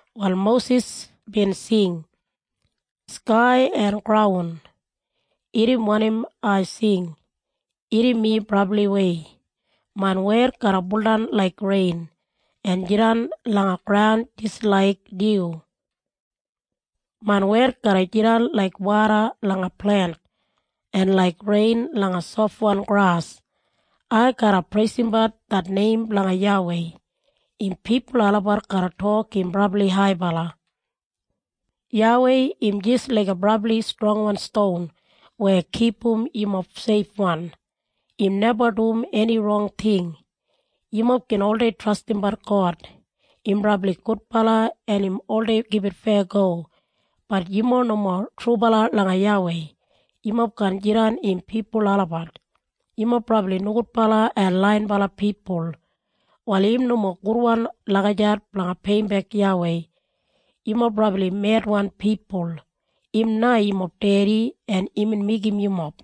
Wal Mosis bin sing, “Skai en graun, irrim wanim ai sing. Irrim mi brabliwei. Main wed garra buldan laik rein, en jidan langa graun jis laik dyu. Main wed garra jidan laik woda langa plent, en laik rein langa sofwan gras. Ai garra preisimbat det neim blanga YAWEI. Im pipul olabat garra tok im brabli haibala. “YAWEI im jis laiga brabli strongwan ston weya kipum yumob seifwan. Im neba dum eni rong ting. Yumob gin oldei trastimbat God. Im brabli gudbala en im oldei gibit feyago. Bat yumob nomo trubala langa YAWEI. Yumob kaan jidan im pipul olabat. Yumob brabli nogudbala en laiyinbala pipul. Wal im nomo gudwan lagijat blanga peiyimbek YAWEI. Yumob brabli medwan pipul. Im na yumob dedi en imbin meigim yumob.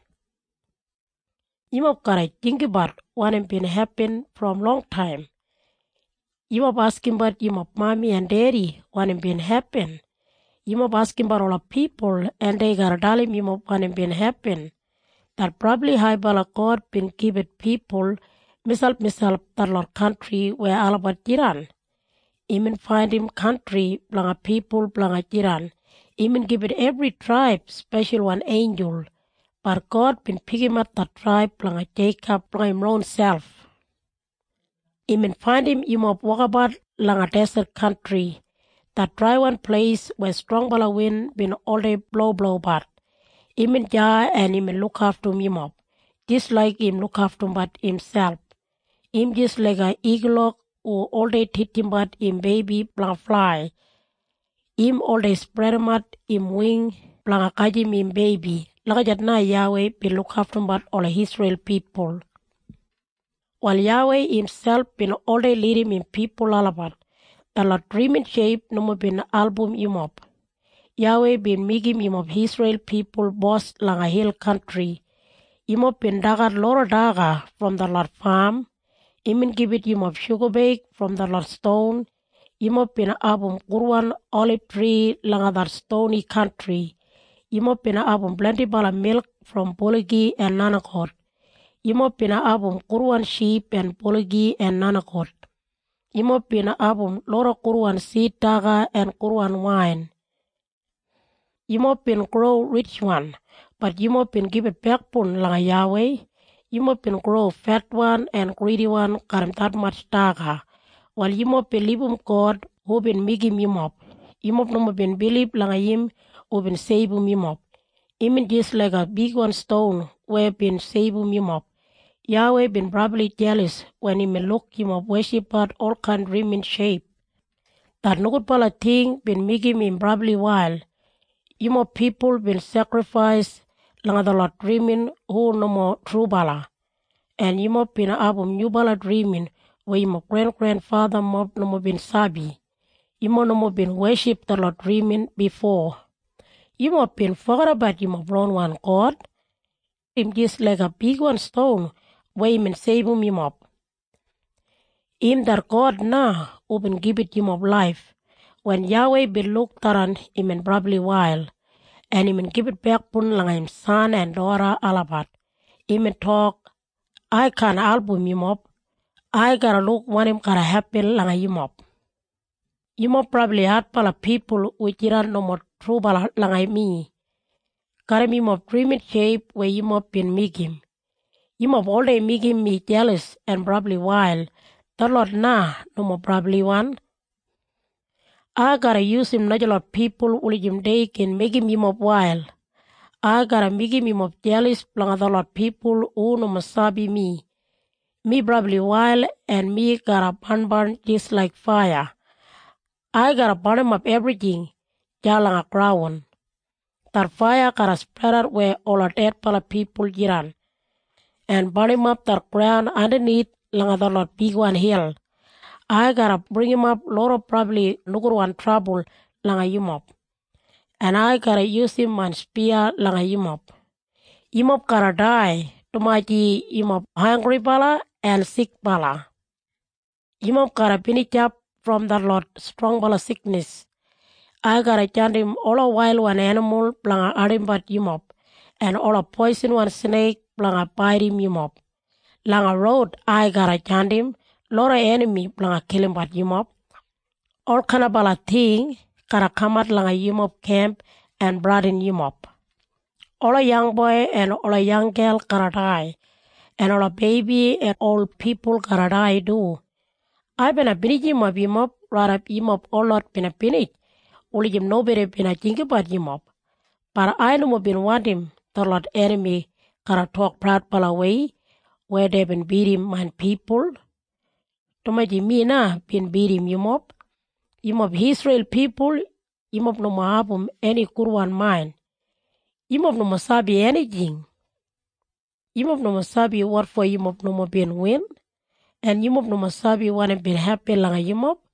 “Yumob garra jinggabat wanim bin hepin brom longtaim. Yumob askimbat yumob mami en dedi wanim bin hepin. Yumob askimbat ola pipul en dei garra dalim yumob wanim bin hepin. Det brabli haibala God bin gibit pipul miselpmiselp detlot kantri weya olabat jidan. Imbin faindim kantri blanga pipul blanga jidan. Imbin gibit ebri traib speshalwan einjul. Bat God bin pikimat det traib blanga Jeikob blanga im ronselp. “Imbin faindim yumob wokabat langa deset kantri, det draiwan pleis weya strongbala win bin oldei bloblobat. Imbin deya en imbin lukaftum yumob, jis laik im lukaftumbat imselp. Im jis laiga igulok hu oldei titjimbat im beibi blanga flai. Im oldei spredimat im wing blanga gajim im beibi. Lagijat na YAWEI bin lukaftumbat ola Isreil pipul. Wal YAWEI imselp bin oldei lidim im pipul olabat. Detlot drimin sheip nomo bin album yumob. “YAWEI bin meigim yumob Isreil pipul bos langa hil kantri. Yumob bin dagat loda daga brom detlot fam. Imbin gibit yumob shugabeig brom detlot ston. Yumob bin abum gudwan olibtri langa det stoni kantri. Yumob bin abum blendibala milk brom buligi en nenigout. Yumob bin abum gudwan ship en buligi en nenigout. Yumob bin abum loda gudwan sid daga en gudwan wain. “Yumob bin gro ritjwan, bat yumob bin gibit bekboun langa YAWEI. Yumob bin gro fetwan en gridiwan garram detmatj daga. Wal yumob bin libum God hubin meigim yumob. Yumob nomo bin bilib langa im hubin seibum yumob. Imbin jis laiga bigwan ston weya bin seibum yumob. YAWEI bin brabli jelas wen imbin luk yumob weshipbat olkain drimin sheip. Det nogudbala ting bin meigim im brabli wail. Yumob pipul bin sekrifais langa detlot drimin hu nomo trubala, en yumob bin abum nyubala drimin weya yumob grengrenfathamob nomo bin sabi. Yumob nomo bin weship detlot drimin bifo. Yumob bin fogedabat yumob ronwan God. Im jis laiga bigwan ston weya bin seibum yumob. Im det God na hubin gibit yumob laif. “Wen YAWEI bin luk tharran imbin brabli wail, en imbin gibit bekboun langa im san en doda olabat. Imbin tok, ‘Ai kaan album yumob. Ai garra luk wanim garra hepin langa yumob. Yumob brabli adbala pipul hu jidan nomo trubala langa mi. Garram yumob drimin sheip weya yumob bin meigim, yumob oldei meigim mi jelas en brabli wail. Detlot na nomo brabliwan. Ai garra yusum najalot pipul wulijim dei gin meigim yumob wail. Ai garra meigim yumob jelas blanga detlot pipul hu nomo sabi mi. Mi brabli wail en mi garra barnbarn jis laiga faiya. Ai garra barnimap ebrijing deya langa graun. Det faiya garra spredat weya ola dedbala pipul jidan, en barnimap det graun andanith langa detlot bigwan hil. “‘Ai garra bringimap loda brabli nogudwan trabul langa yumob, en ai garra yusum main spiya langa yumob. Yumob garra dai dumaji yumob hanggribala en sikbala. Yumob garra binijap brom detlot strongbala siknis. Ai garra jandim ola wailwan enimul blanga ardimbat yumob, en ola poisinwan sneik blanga baidim yumob. Langa roud ai garra jandim loda enami blanga kilimbat yumob. Olkain ting garra kamat langa yumob kemp en bradinim yumob. Ola yangboi en ola yanggel garra dai, en ola beibi en ol pipul garra dai du. Ai bina binijimap yumob raidap yumob holot bin binij, wulijim nobodi bina jinggabat yumob. Bat ai nomo bin wandim detlot enami garra tok praudbalawei weya deibin bidim main pipul, dumaji mi na bin bidim yumob.’ “Yumob Isreil pipul yumob nomo abum eni gudwan main. Yumob nomo sabi enijing. Yumob nomo sabi wotfo yumob nomo bin win, en yumob nomo sabi wanim bin hepin langa yumob.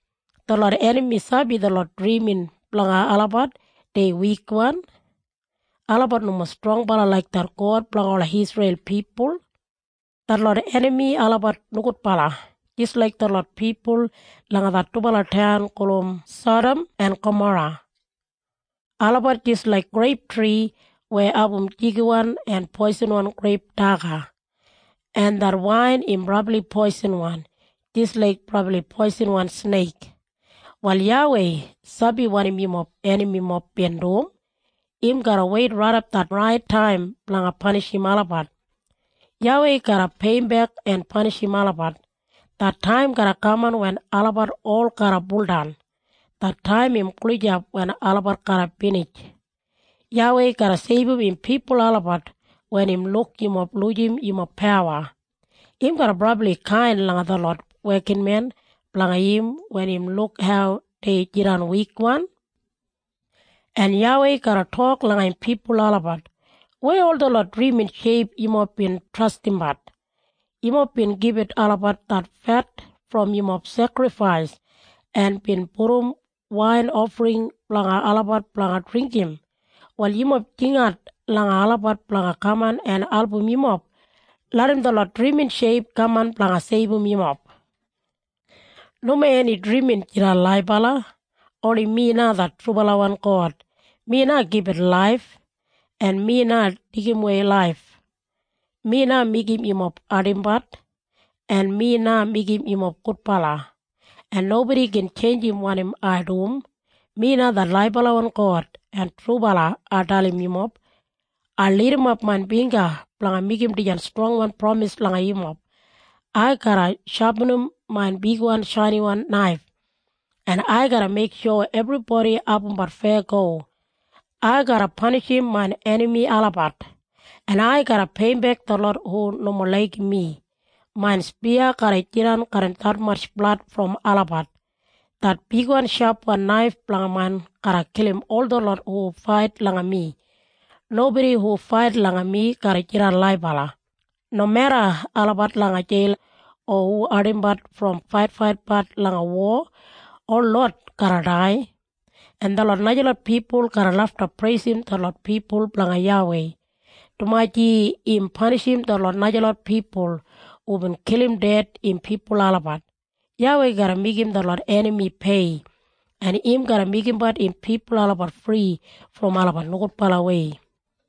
Detlot enami sabi detlot drimin blanga olabat dei wikwan. Olabat nomo strongbala laik det God blanga ola Isreil pipul. Detlot enami olabat nogudbala, jis laik detlot pipul langa det dubala taun gulum Sadam en Gamora. Olabat jis laik greiptri weya abum jigiwan en poisinwan greip daga, en det wain im brabli poisinwan, jis laik brabli poisinwan sneik. “Wal YAWEI sabi wanim yumob enamimob bin dum. Im garra weit raidap det rait taim blanga panishim olabat. YAWEI garra peiyimbek en panishim olabat. Det taim garra kaman wen olabat ol garra buldan. Det taim im gulijap wen olabat garra binij. YAWEI garra seibum im pipul olabat wen im luk yumob lujim yumob pawa. Im garra brabli kain langa detlot wekinmen blanga im wen im luk hau dei jidan wikwan. En YAWEI garra tok langa im pipul olabat, ‘Weya ol detlot drimin sheip yumob bin trastimbat? Yumob bin gibit olabat det fet brom yumob sekrifais, en bin pudum wain ofring blanga olabat blanga dringgim. Wal yumob jingat langa olabat blanga kaman en album yumob. Larram detlot drimin sheip kaman blanga seibum yumob. “‘Nomo eni drimin jidan laibala. Oni mi na det trubalawan God. Mi na gibit laif, en mi na deigimwei laif. Mi na meigim yumob ardimbat, en mi na meigim yumob gudbala, en nobodi gin tjeinjim wanim ai dum. Mi na det laibalawan God en trubala ai dalim yumob. Ai lidimap main bingga blanga meigim dijan strongwan pramis langa yumob. Ai garra shapinim main bigwan shainiwan naif, en ai garra meiksho ebribodi abumbat feyago. Ai garra panishim main enami olabat, en ai garra peiyimbek detlot hu nomo laigim mi. Main spiya garra jidan garram detmatj blad brom olabat. Det bigwan shapwan naif blanga main garra kilim ol detlot hu fait langa mi. Nobodi hu fait langa mi garra jidan laibala, nomeda olabat langa jeil o hu ardimbat brom faitfaitbat langa wo. Holot garra dai.’ “En detlot najalot pipul garra lafta preisim detlot pipul blanga YAWEI, dumaji im panishim detlot najalot pipul hubin kilim ded im pipul olabat. YAWEI garra meigim detlot enami pei, en im garra meigimbat im pipul olabat fri brom olabat nogudbalawei.”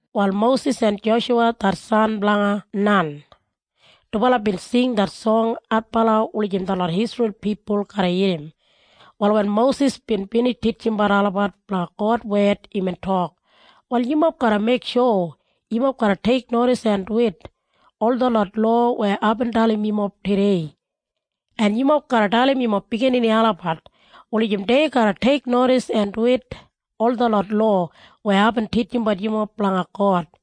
Wal Mosis en Joshuwa det san blanga Nan, dubala bin singsing det song adbala wulijim detlot Isreil pipul garra irrim. Wal wen Mosis bin binij titjimbat olabat blanga God wed imbin tok, “Wal yumob garra meiksho yumob garra teiknodis en duwit ol detlot lowa weya aibin dalimbat yumob tudei. En yumob garra dalim yumob biginini olabat, wulijim dei garra teiknodis en duwit ol detlot lowa weya aibin titjimbat yumob blanga God.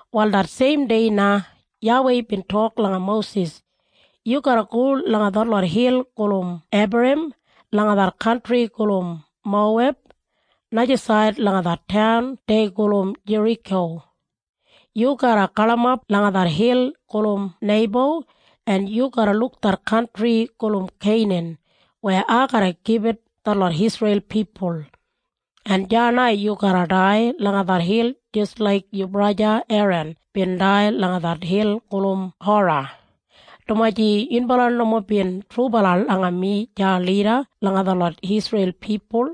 Wal det seimdei na YAWEI bin tok langa Mosis, “Yu garra go langa detlot hil gulum Ebarim langa det kantri gulum Moweb, najasaid langa det taun dei gulum Jeriko. Yu garra galimap langa det hil gulum Neibo, en yu garra luk det kantri gulum Keinan weya ai garra gibit detlot Isreil pipul. En deya na yu garra dai langa det hil jis laik yu braja Eran bin dai langa det hil gulum Hora, dumaji yunbala nomo bin trubala langa mi deya lida langa detlot Isreil pipul.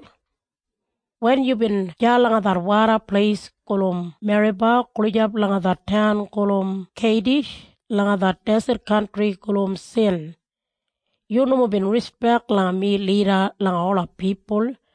Wen yubin deya langa det woda pleis gulum Meriba gulijap langa det taun gulum Keidish langa det deset kantri gulum Sin, yu nomo bin rispek langa mi lida langa ola pipul.